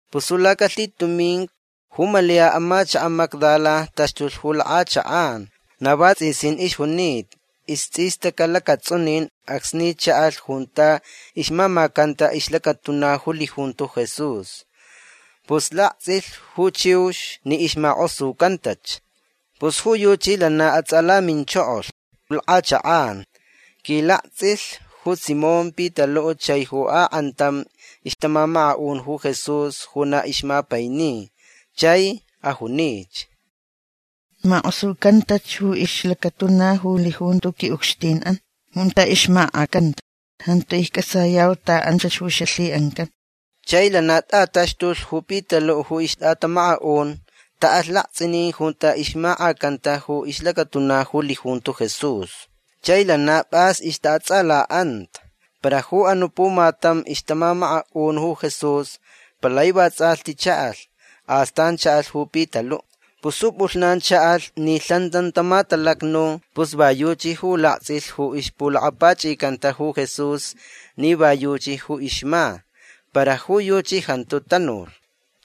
Pus ju lacalhitumincu ju Malia amachaka' Magdala taxtulh ju lak'achak'an. Na vats'isin ixjunita. Ists'istaca' lacats'unin acsni cha'alh junta ixmamacanta ixlacatuna ju lijunto Jesús. Pus lakts'ilh ju chiux ni ixmak'osucantach. Pus ju yuchi lana ats'alaminchokolh lak'achak'an. Quilakts'ilh ju Simón Pitalu' chai ju ak'antam ixtamamaka'un ju Jesús ju na ixmapaini. Chai ajunich: ―Mak'osucantach ju ixlacatuna ju lijunto qui'ucxtin'an junta ixmak'acanta. Jantu icc'atsayau ta anchach ju xalhi'ancan. Chai lana t'ataxtulhch ju Pitalu' ju ixt'atamaka'un. Ta'alh lakts'inin junta ixmak'acanta ju ixlacatuna ju lijunto Jesús. Chai lana p'as ixta'ats'ala'anta. Para ju anu' pumatam ixtamamaka'un ju Jesús palai vats'alhti cha'alh. Astan cha'alh ju Pitalu'. Pus ju p'ulhnan cha'alh ni lhan tantama talacnu pus va yuchi ju lakts'ilhch ju ixpulakapach'icanta ju Jesús ni va yuchi ju ixma. Para ju yuchi jantu tanulh.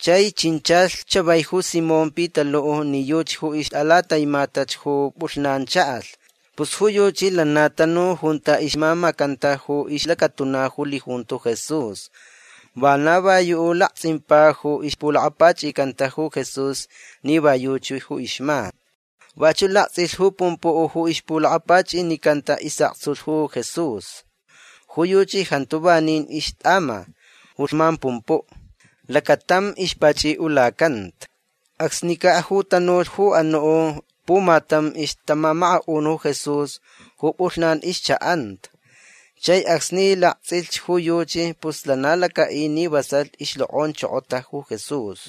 Chai chinchalh chavai ju Simón Pitalu' ni yuchi ju ixt'alataimatach ju p'ulhnan cha'alh. Pus ju yuchi lana tanu junta ixmamacanta ju ixlacatuna ju lijunto Jesús. Vana va yu' ju lakts'impa ju ixpulakapach'icanta ju Jesús ni va yuchi ju ixma. Vachu' lakts'ilh ju pumpu' ju ixpulakapach'inicanta is'aktsulh ju Jesús. Ju yuchi jantu vanin ixt'ama ju lhman pumpu'. Lacatam ixpach'i'ulacanta. Acsnica' ju tanulh ju anu' pumatam ixtamamaka'un ju Jesús ju p'ulhnan ixcha'anta. Chai acsni lakts'ilhch ju yuchi pus lana laca'i ni vasalh ixlok'onchokota ju Jesús.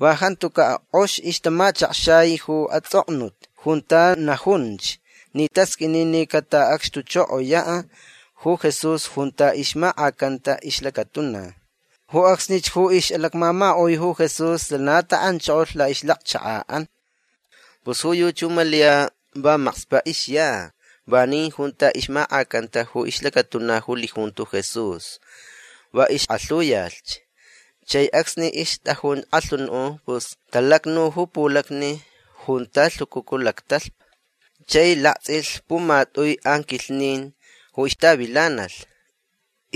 Va jantuca' k'ox ixtamachakxai ju ats'oknut junta najunch ni tasq'uini ni cata'acxtuchokoya' ju Jesús junta ixmak'acanta ixlacatuna. Ju acsnich ju ix'alacmamaka'ui ju Jesús lana ta'anchokolh la'ixlacchaka'an. Pus ju yuchi ju Malia va makspa' ixya. Vanin junta ixmak'acanta ju ixlacatuna ju lijunto Jesús. Va ixk'alhuyalhch. Chai acsni ixt'ajun k'alhunu' pus talacnu ju pulacni junta lhucucu lactalhpa. Chai lakts'ilh pumat'ui anquilhnin ju ixtavilanalh.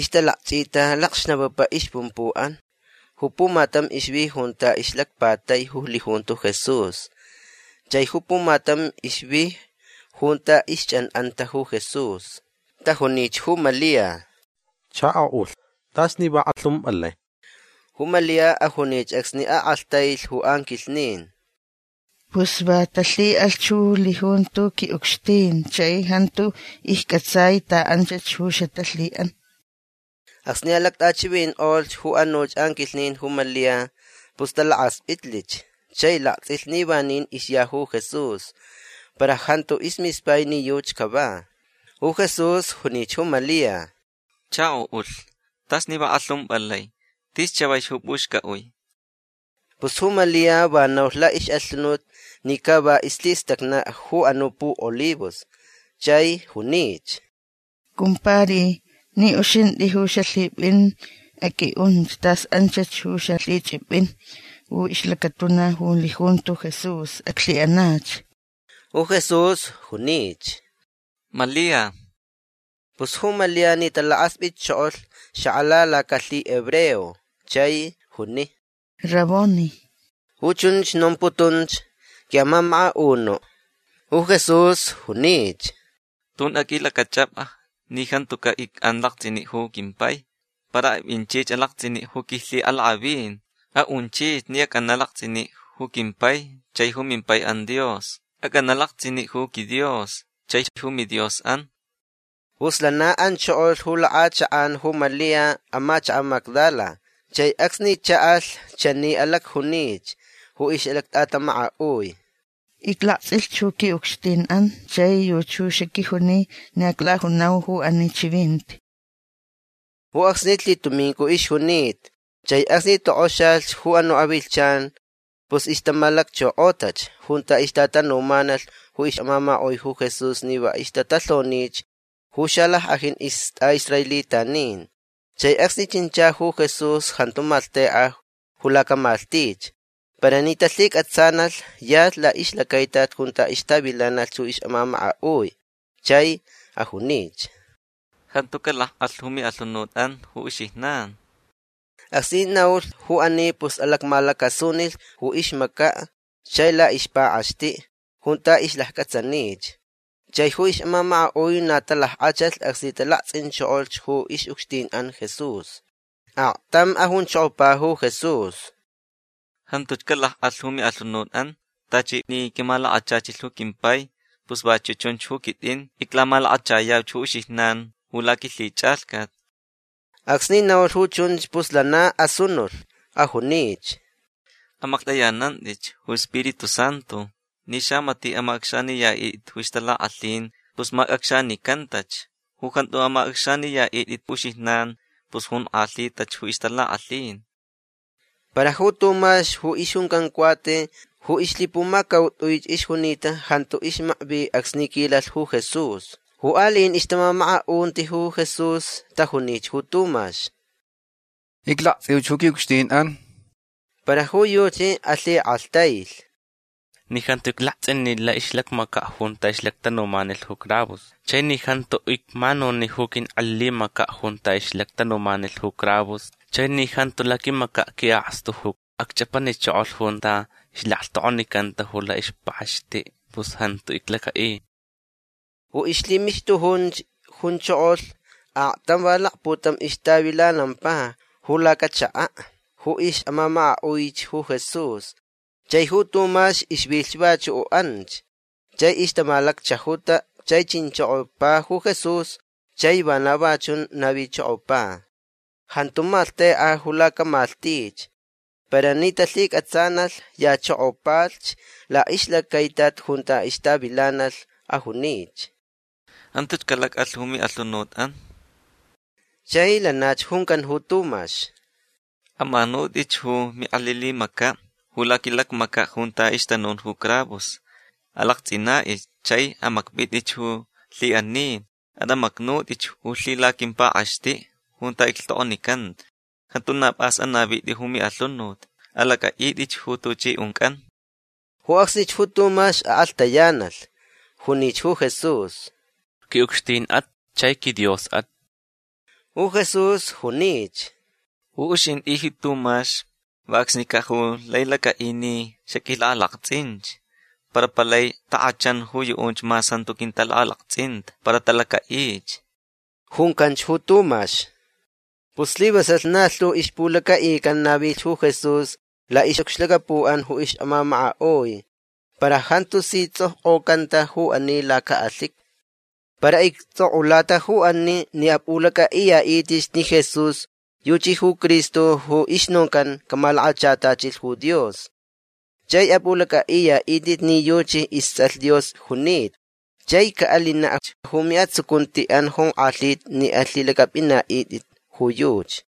Ixtalakch'ita lacxnapapa ixpumpu'an. Ju pumatam ixvi junta ixlacpatai ju lijunto Jesús. Chai ju pumatam ixvi junta ixch'an'anta ju Jesús. Tajunich ju Malia: ―Chako'ulh t'as ni va k'alhump'alai. Ju Malia ajunich acsni ak'alhtailh ju anquilhnin: ―Pus va talhi'alhch ju lijunto qui'ucxtin chai jantu icc'atsai ta anchach ju xatalhi'an. Acsni alact'achivink'olh ju anuch anquilhnin ju Malia pus talakasp'itlich chai lakts'ilh ni vanin ixya ju Jesús. Para jantu ismispai ni yuchi cava. Ju Jesús junich ju Malia: ―Chako'ulh t'as ni va k'alhump'alai. Tis chavaich ju p'uxc'a'ui. Pus ju Malia va naulh la'ix'alhunut ni ca va islhistacna' ju anu' pu'olivos. Chai junich: ―Cumpari ni uxint'i ju xalhip'in aq'ui'unch tas anchach ju xalhich'ip'in ju ixlacatuna ju lijunto Jesús. Aclhi'anach. Ju Jesús junich: ―Malia. Pus ju Malia ni talakasp'itchokolh xak'ala lacalhihebreo chai juni: ―Raboni. Ju chunch nomputunch: “Qui'amamaka'unu'”. Ju Jesús junich: ―Tun aq'uilac'ach'ap'a ni jantuca' ic'an lakts'ini' ju quimpai. Para ap'inchich alakts'ini' ju quilhi'alak'avin. A'unchich ni ac'ana' lakts'ini' ju quimpai chai ju mimpai'an Dios. Ac'ana' lakts'ini' ju quiDios chaich ju miDios'an. Pus lana anchokolh ju lak'achak'an ju Malia amachaka' Magdala. Chai acsni cha'alh chani alacjunich ju ix'alact'atamaka'ui: ―Iclakts'ilhch ju qui'ucxtin'an. Chai yuchi ju xaquijuni ni aclajunau ju ani chivinti. Ju acsnich lhitumincu ixjunita. Chai acsni tok'oxalhch ju anu' avilhchan pus ixtamalacchok'otach junta ixtatanumanalh ju ix'amamaka'ui ju Jesús ni va ixtatalhonich ju xalack'ajin ist'a'israelitanin. Chai acsni chincha ju Jesús jantu maklht'ek'a ju lacamalhtich. Para ni talhic'atsanalh yalhch la'ixlacaitat junta ixtavilanalhch ju ix'amamaka'ui. Chai ajunich: ―Jantu calac'alh ju mi'alhunut'an ju uxijnan. Acsni naulh ju ani pus alacmalacasunilh ju ixmaca' chai la'ixpak'axti' junta ixlacc'atsanich. Chai ju ix'amamaka'ui na talack'achalhch acsni talakts'inchokolh ju ix'ucxtin'an Jesús. Aktam ajunchokopa ju Jesús: ―Jantuch calac'alh ju mi'alhunut'an. Tachi ni quimalakachachilh ju quimpai pus vachu' chunch ju quit'in iclamalakachayauch ju uxijnan ju laquilhich'alhcat. Acsni naulh ju chunch pus lana asunulh. Ajunich: ―Amaklht'ayanant'itch ju Spiritu Santu. Ni xamati' amac'acxaniya'it'it ju ixtalak'alhin pus mac'acxanicantach. Ju jantu amac'acxaniya'it'it uxijnan pus jonk'alhitach ju ixtalak'alhin. Para ju Tumax ju ixjuncan Cuate ju ixlhipumacaut'uich ixjunita jantu ixmakvi acsni quilalh ju Jesús. Ju ali'in ixtamamaka'unti ju Jesús tajunich ju Tumax: ―Iclakts'iuch ju qui'ucxtin'an. Para ju yuchi alhik'alhtailh: ―Ni jantu iclakts'ini ju la'ixlacmaca' junta ixlactanumanilh ju cravos chai ni jantu icmanuni ju quink'elilimaca' junta ixlactanumanilh ju cravos chai ni jantu laquimaca' qui'akstu ju acch'apanichokolh junta ilhtok'onicanta ju la'ixpak'axti' pus jantu iclaca'i. Ju ixlhimixtujunch junchokolh aktam va lakputam ixtavilanampa ju lacachaka' ju ix'amamaka'uich ju Jesús. Chai ju Tumax ixvilhch vachu' anch. Chai ixtamalacchajuta. Chai chinchokopa ju Jesús chai vana va chun navichokopa. Jantu maklhteka ju lacamalhtich. Para ni talhic'atsanalh yachokopalhch la'ixlacaitat junta ixtavilanalh. Ajunich: ―Jantuch calac'alh ju mi'alhunut'an. Chai lanach juncan ju Tumax: ―Amanut'ich ju mink'elilimaca' ju laquilacmaca' junta ixtanun ju cravos. Alakts'ina'ich. Chai amakp'it'ich ju lhi'ani. At'amacnut'ich ju lhilaquimpak'axti' junta iclhtok'onicanta. Jantu na p'as anavit'i ju mi'alhunut. Alac'a'it'i ju tuch'i unc'an. Ju acsnich ju Tumax ak'alhtayanalh. Junich ju Jesús: ―Qui'ucxtin'at chai quiDios'at. Ju Jesús junich: ―Ju uxint'i ji Tumax va acsnica' ju lai lac'a'i ni xaq'uilak'alakts'inch. Para palai tak'achan ju yu'unch mas jantu quintalak'alakts'inta para talaca'ich. ―Juncanch ju Tumax. Pus slivasalh na lhu ixpulaca'ican navilh ju Jesús la'ix'ucxlacapu'an ju ix'amamaka'ui. Para jantu si ts'okk'ocanta ju ani laca'alhiqui. Para icts'ok'ulata ju ani ni ap'ulac'a'iya'it'itch ni Jesús yuchi ju Cristo ju ixnoncan camalakachatachilh ju Dios. Chai ap'ulac'a'iya'it'it ni yuchi ists'alh Dios junita. Chai ca'alinach ju mi'atsucunti'an jonk'alhita ni alhilac'ap'ina'it'it ju yuchi.